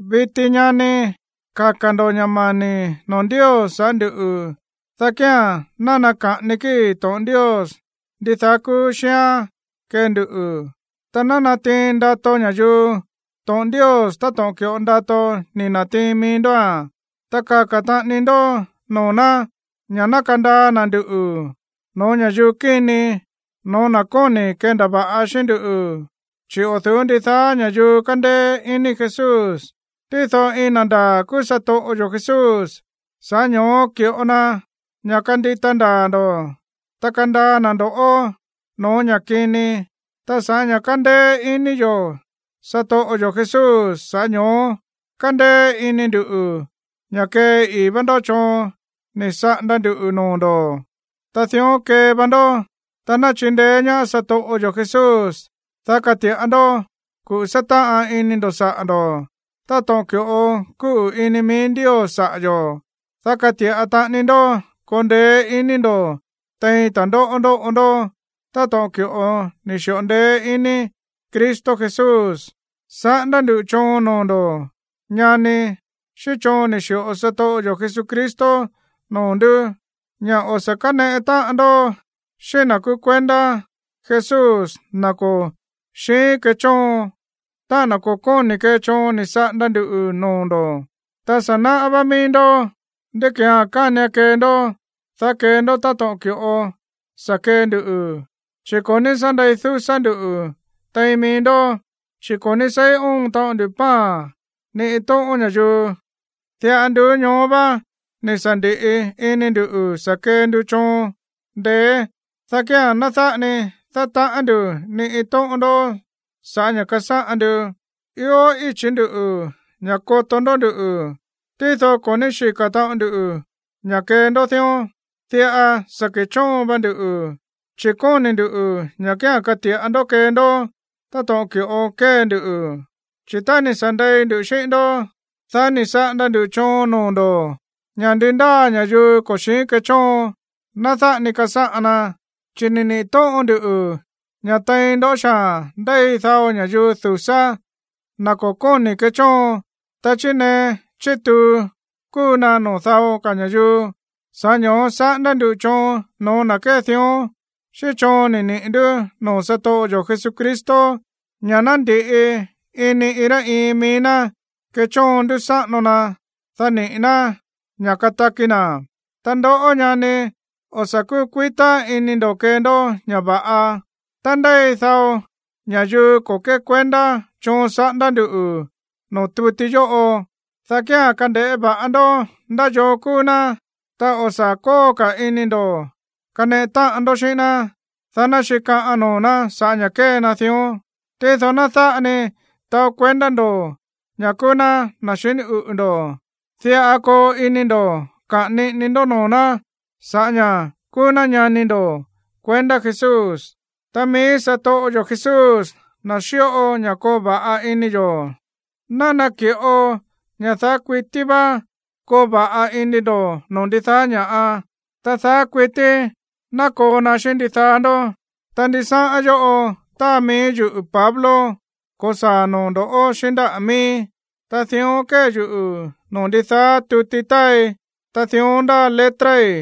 Viti, ñani, kaka̱ ndo̱ ña̱ mani̱ noo̱ Ndios sa̱ꞌá nduꞌu̱, dá kía̱n ná naka̱ꞌani kíi̱ to̱ꞌon Ndios ndidaá kúú xíán kee nduꞌu̱, ta ná natiin ndato ña̱yuu to̱ꞌon Ndios táto̱ꞌon ki̱ꞌo ndato ni̱ na̱tiin mií ndóa̱n. Ta kaka̱ taꞌani ndó noo̱ ná ña̱ ná kandaa na̱ nduꞌu̱ no̱ó ña̱yuu kíni, no̱ó na̱ kóni̱ kendava̱ꞌa xíꞌín ndú, chi̱ o̱ du̱ú ndidaá ña̱yuu kándéé iní Jesús. Tído iin na̱ ndaa̱ kúú satoꞌo yo̱ Jesús, sa̱ꞌá ño̱ó ki̱ꞌo na ña̱ kandita ndaa̱ ndo̱, ta kandaa na̱ ndo̱ꞌó no̱ó ña̱ kini. Ta sa̱ꞌá ña̱ kándéé iní yo̱ satoꞌo yo̱ Jesús, sa̱ꞌá ño̱ó kándéé iní ndu̱ ña̱ kée ii̱ vá ndó choon ni̱ saꞌanda nduꞌu̱ noo̱ ndo̱, ta dión kee va ndó. Ta ná chindeé ñaá satoꞌo yo̱ Jesús, dá kati̱ꞌa ndó kuꞌu̱ sátáꞌan ini ndo̱ saꞌa̱ ndo̱, táto̱ꞌon ki̱ꞌo kúꞌu̱ ini mií Ndios saꞌa̱ yo̱. Dá kati̱ꞌa taꞌani ndó koo ndeé iní ndo̱ tein ta̱ndóꞌó ndóꞌo ndó táto̱ꞌon ki̱ꞌo ni̱ xi̱ꞌo ndeé iní Cristo Jesús. Saꞌándá ndu̱ choon noo̱ ndo̱, ñani, xíꞌín choon ni̱ xi̱ꞌo satoꞌo yo̱ Jesucristo noo̱ ndú, ña̱ o̱ sa̱ káneꞌe táꞌan ndó xíꞌín na̱ kúú kuendá Jesús, na̱ ko̱ xíin kechóon, táꞌa̱n na̱ ko̱ kóni̱ kee choon ni̱ saꞌanda ndu̱ noo̱ ndo̱. Ta sa̱ náꞌá vá mií ndó ndí ki̱án kánian kee ndó, dá kee ndó táto̱ꞌon ki̱ꞌo sa̱ kee ndu, chi̱ ko̱ ní sá ndei dúsá ndú tein mií ndó. Chi̱ ko̱ ní seí óon taꞌon ndu pan ni iin tóꞌón ña̱yuu. Diꞌa nduú ñoó va ni̱ sa̱ ndi̱ꞌi ini ndu̱ sa̱ kee ndu choon ndeé, dá kía̱n ná dáꞌa ni dátaꞌán ndu̱ ni iin ndoꞌó sa̱ꞌá ña̱ kasáꞌan ndu. Ió íchi̱ ndú ña̱ koto ndó nduꞌu̱, tído ko̱ ní xíka̱ taꞌon ndu ña̱ kee ndó dión. Diꞌa sa̱ ke̱chóon va nduꞌu̱, chi̱ kóni̱ ndu̱ ña̱ kía̱n kati̱ꞌa ndó kee ndó táto̱ꞌon ki̱ꞌo kée nduꞌu̱. Chi̱ tá ni̱ sa̱ ndei ndu xíꞌín ndó, dá ni̱ saꞌanda ndu̱ choon noo̱ ndo̱ ña̱ ndi ndáa ña̱yuu ko̱ xíin kechóon, ná dáꞌa ni kasáꞌan na. Chi̱ ni̱ niꞌi̱ tóꞌon nduꞌu̱ ña̱ tein ndó xaa̱n ndéi dao ña̱yuu dúsá, na̱ ko̱ kóni̱ kechóon, ta chírnee chítuu kúu na noo̱ dao ka̱ ña̱yuu. Sa̱ꞌá ño̱ó saꞌándá ndu̱ choon no̱ó na̱ kée dión xíꞌín choon ni̱ niꞌi̱ ndú noo̱ satoꞌo yo̱ Jesucristo, ña̱ ná ndi̱ꞌi ini iin rá iin mií ná kechóon ndúsáꞌano ná, dá niꞌi̱ ná ña̱ kataki na̱. Ta ndoꞌó, ñani, o̱ sa̱ kúkuitá iní ndo̱ kee ndó ña̱ va̱ꞌa. Tá ndéi dao ña̱yuu ko̱ kékuendá choon saꞌándá ndu̱ noo̱ tuti yóꞌo, dá kía̱n kande̱ꞌé va̱ꞌa ndó ndá yoo kúú ná, ta o̱ sa̱ kóo ka̱ ini ndo̱ kaneꞌe táꞌan ndó xíꞌín ná, dá ná xikaꞌan noo̱ ná sa̱ꞌá ña̱ kée na dión. Tído ná dáꞌa ni taó kuendá ndo̱ ña̱ kúú ná na̱ xiní uꞌu̱ ndo̱, diꞌa koo ini ndo̱ kaꞌa̱n niꞌini ndó noo̱ ná sa̱ꞌá ña̱ kúú ná ñani ndo̱ kuendá Jesús. Ta mií satoꞌo yo̱ Jesús, na̱ xíꞌo ña̱ ió va̱ꞌa ini yo̱, ná naki̱ꞌo ña̱ daá kuití vá koo va̱ꞌa ini ndo̱ noo̱ ndidaá ña̱ꞌa. Ta daá kuití ná koo na xíꞌín ndidaá ndó. Ta ndisáꞌán yóꞌo táa mií yuꞌu̱ Pablo ko̱saa̱ noo̱ ndo̱ꞌó xíꞌín ndáꞌa̱ miíi̱. Ta dión kée yuꞌu̱ noo̱ ndidaá tuti táai, ta dión ndáa letrai̱.